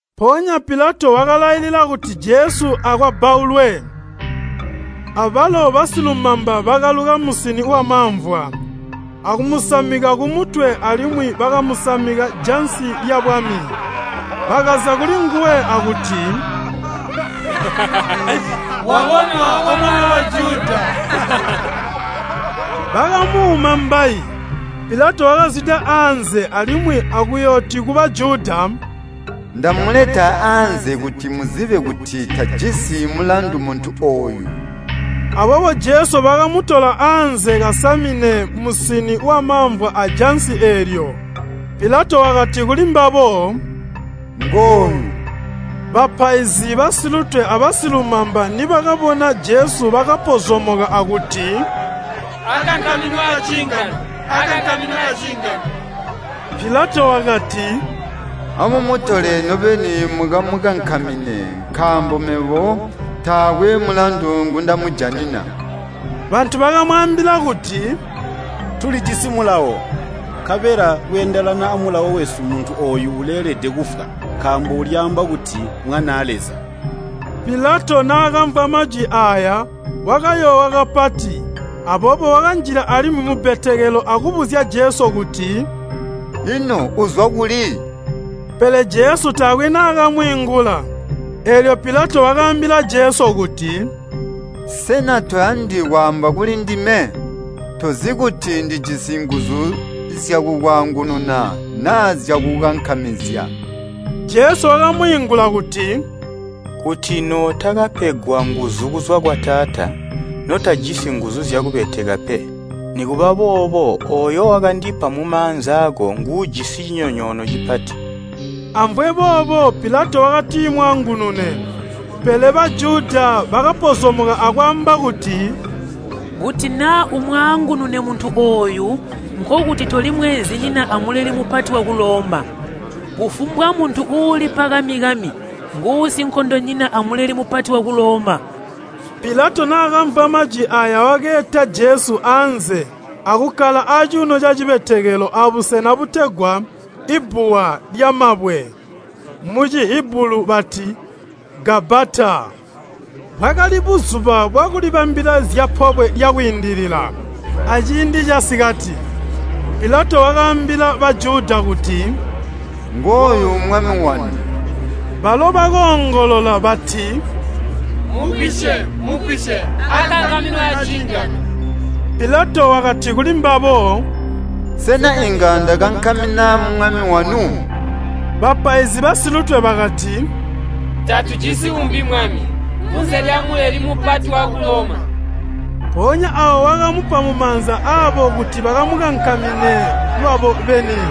Mpoonya Pilato wakalailila kuti Jesu akwabbaulwe. Abalo basilumamba bakaluka musini wamamvwa, akumusamika kumutwe, alimwi bakamusamika jansi lyabwami. Bakaza kulinguwe akuti, “Wabonwa, O Mwami wa Bajuda!” Bakamuuma mbayi. Pilato wakazwida anze alimwi akuyooti ku Bajuda, “Ndamuleta anze kuti muzibe kuti tajisi mulandu muntu ooyu!” Aboobo Jesu bakamutola anze kasamine musini wamamvwa ajansi eelyo. Pilato wakati kulimbabo, “Ngooyu!” Bapaizi basilutwe abasilumamba nibakabona Jesu bakapozomoka akuti, “Akankaminwe aciingano! Akankaminwe aciingano!” Pilato wakati, “Amumutole nobeni mukamukankamine, nkaambo mebo taakwe mulandu ngundamujanina.” Bantu bakamwaambila kuti, “Tulijisi mulawo, nkabela kweendelana amulawo wesu muntu ooyu uleelede kufwa, nkaambo ulyaamba kuti Mwanaa Leza.” Pilato naakamvwa majwi aaya, wakayoowa kapati. Aboobo wakanjila alimwi mubbetekelo akubuzya Jesu kuti, “Ino uzwa kuli?” Pele Jesu taakwe naakamwiingula. Eelyo Pilato wakaambila Jesu kuti, “Sena toyandi kwaamba kulindime? Tozi kuti ndijisi nguzu zyakukwaangununa naa zyakukukankamizya?” Jesu wakamwiingula kuti, “Kuti nootakapegwa nguzu kuzwa kwa Taata notajisi nguzu zyakubeteka pe. Nikuba boobo ooyo wakandipa mumaanza aako nguujisi cinyonyoono cipati.” Amvwe boobo Pilato wakatimwaangunune, pele Bajuda bakapozomoka akwaamba kuti, “Kuti naa umwaangunune muntu ooyu, nkokuti toli mweenzinyina a Muleli Mupati waku Loma. Kufumbwa muntu uulipa kami-kami nguusinkondonyina a Muleli Mupati waku Loma.” Pilato naakamvwa majwi aaya wakeeta Jesu anze akukkala acuuno cacibetekelo abusena butegwa, “Ibbuwa lyamabwe” (mu Cihibulu bati, “Gabbata.”) Bwakali buzuba bwakulibambila zya Pobwe lya Kwiindilila, aciindi casikati. Pilato wakaambila Bajuda kuti, “Ngooyu Mwami wanu!” Balo bakoongolola bati, “Mugwisye, mugwisye! Akankaminwe aciingano!” Pilato wakati kulimbabo, “Sena inga ndakankamina Mwami wanu?” Bapaizi basilutwe bakati, “Tatujisi uumbi Mwami kunze lya Muleli Mupati waku Loma.” Mpoonya aawo wakamupa mumaanza aabo kuti bakamukankamine lwabo beni.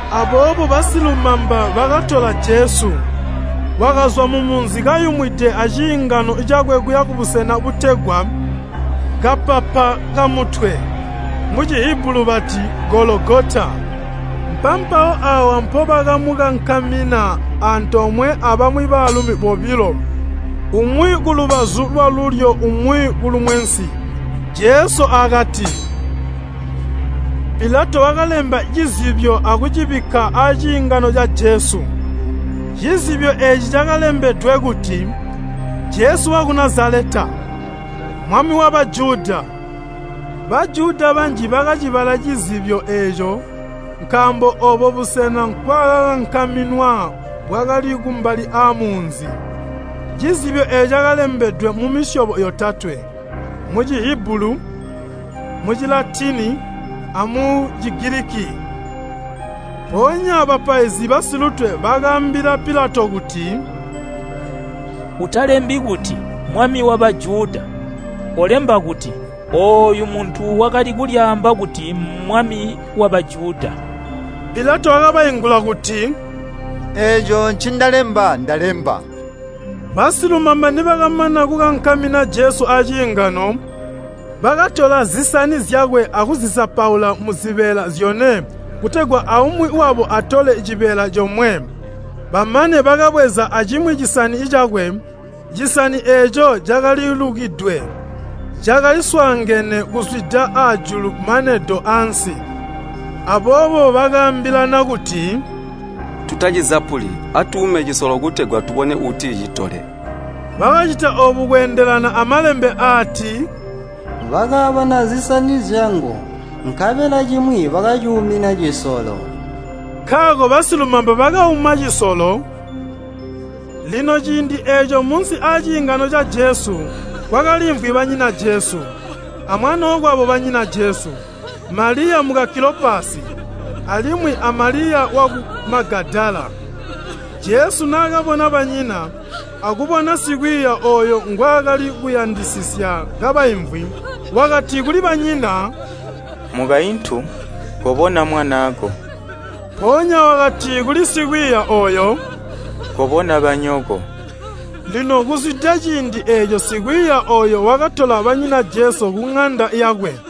Aboobo basilumamba bakatola Jesu. Wakazwa mumunzi kayumwide aciingano cakwe kuya kubusena butegwa, “Kapapa kamutwe.” (Mu Cihibulu bati, “Gologota.”) Mpampawo aawa mpobakamukankamina antoomwe abamwi baalumi bobilo, umwi kulubazu lwalulyo umwi kulumwensi, Jesu, akati. Pilato wakalemba cizibyo akucibikka aciingano ca Jesu. Cizibyo eeci cakalembedwe kuti, “Jesu waku Nazaleta, Mwami wa Bajuda.” Bajuda banji bakacibala cizibyo eeco nkaambo oobo busena nkwaakakankaminwa bwakali kumbali aamunzi. Cizibyo eeco cakalembedwe mumisyobo yotatwe, mu Cihibulu, mu Cilatini, amu Cigiliki. Mpoonya bapaizi basilutwe bakaambila Pilato kuti, “Utalembi kuti, ‘Mwami wa Bajuda,’ kolemba kuti, ‘Ooyu muntu wakali kulyaamba kuti Mmwami wa Bajuda.’” Pilato wakabaingula kuti, “Eeco ncindalemba ndalemba.” Basilumamba nibakamana kukankamina Jesu aciingano, bakatola zisani zyakwe akuzizapula muzibeela zyone kutegwa aumwi wabo atole cibeela comwe. Bamane bakabweza acimwi cisani cakwe. Cisani eeco cakalilukidwe, cakali swaangene kuzwida ajulu mane do ansi. Aboobo bakaambilana kuti, “Tutacizapuli, atuume cisolo kutegwa tubone uuticitole.” Bakacita oobu kweendelana a Malembe aati, “Bakaabana zisani zyangu, nkabela cimwi bakacuumina cisolo.” Nkaako basilumamba bakauma cisolo. Lino ciindi eeco munsi aaciingano ca Jesu kwakaliimvwi banyina Jesu amwanookwabo banyina Jesu Maliya muka Kilopasi alimwi a Maliya waku Magadala. Jesu naakabona banyina, akubona sikwiiya ooyo ngwaakali kuyandisisya kabaimvwi, wakati kuli banyina, “Mukaintu, kobona mwanaako!” Mpoonya wakati kuli sikwiiya ooyo, “Kobona banyoko!” Lino kuzwida ciindi eeco sikwiiya ooyo wakatola banyina Jesu kuŋanda yakwe.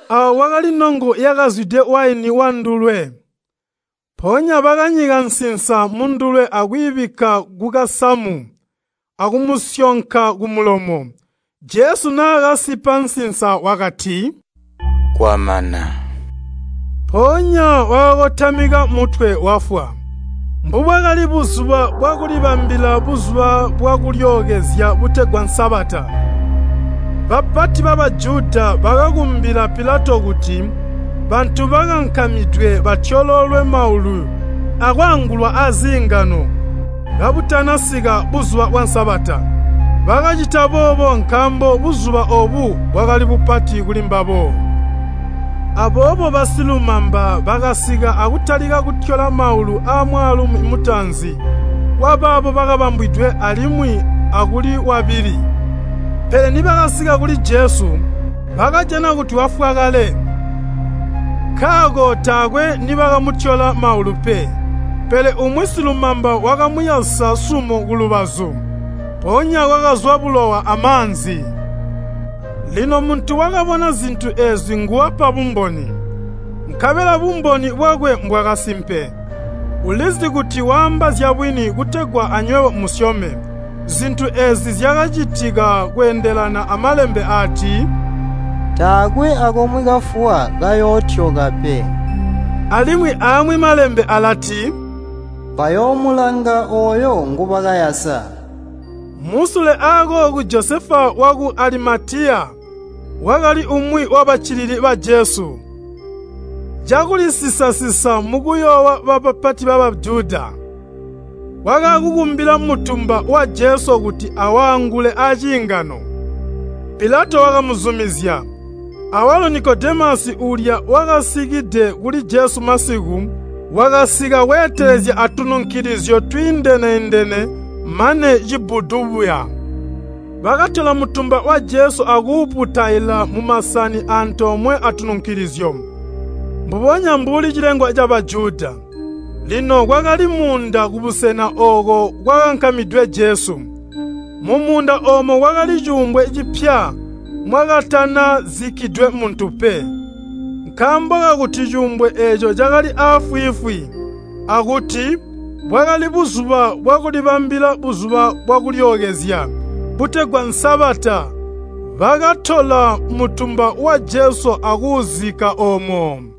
Aawo kwakali nongo yakazwide waini wandulwe. Mpoonya bakanyika nsinsa mundulwe akwiibikka kukasamu akumusyonka kumulomo. Jesu naakasipa nsinsa wakati, “Kwamana.” Mpoonya wakakotamika mutwe wafwa. Mbubwakali buzuba bwakulibambila Buzuba bwa Kulyookezya butegwa Sabata, bapati ba Bajuda bakakumbila Pilato kuti bantu bakankamidwe batyoloolwe maulu akwaangulwa aziingano kabutanasika buzuba bwa Sabata. Bakacita boobo nkaambo buzuba oobu bwakali bupati kulimbabo. Aboobo basilumamba bakasika akutalika kutyola maulu aamwaalumi mutaanzi wabaabo bakabambwidwe alimwi akuli wabili. Pele nibakasika kuli Jesu, bakajana kuti wafwa kale, nkaako taakwe nibakamutyola maulu pe. Pele umwi silumamba wakamuyasa sumo kulubazu, mpoonya kwakazwa bulowa amaanzi. Lino muntu wakabona zintu eezi nguwapa bumboni, nkabela bumboni bwakwe mbwakasimpe. Ulizi kuti waamba zyabwini kutegwa anywebo musyome. Zintu eezi zyakacitika kweendelana a Malembe aati, “Taakwe akomwe kafuwa kayootyoka pe.” Alimwi aamwi Malembe alati, “Bayoomulanga ooyo ngubakayasa.” Musule akooku Josefa waku Alimatiya wakali umwi wabaccili ba Jesu, cakulisisa-sisa mukuyoowa bapati ba Bajuda, wakaakukumbila mutumba wa Jesu kuti awaangule aciingano. Pilato wakamuzumizya. Awalo Nikodemasi uulya wakasikide kuli Jesu masiku, wakasika weetelezya atununkilizyo twiindene-indene mane cibbudu buya. Bakatola mutumba wa Jesu akuuputaila mumasani antoomwe atununkilizyo, mbubonya mbuli cilengwa ca Bajuda. Lino kwakali muunda kubusena ooko kwakakankamidwe Jesu. Mumuunda oomo kwakali cuumbwe cipya mwakatana zikkidwe muntu pe. Nkaambo kakuti cuumbwe eeco cakali aafwiifwi, akuti, bwakali buzuba bwakulibambila Buzuba bwa Kulyookezya butegwa Sabata bakatola mutumba wa Jesu akuuzikka oomo.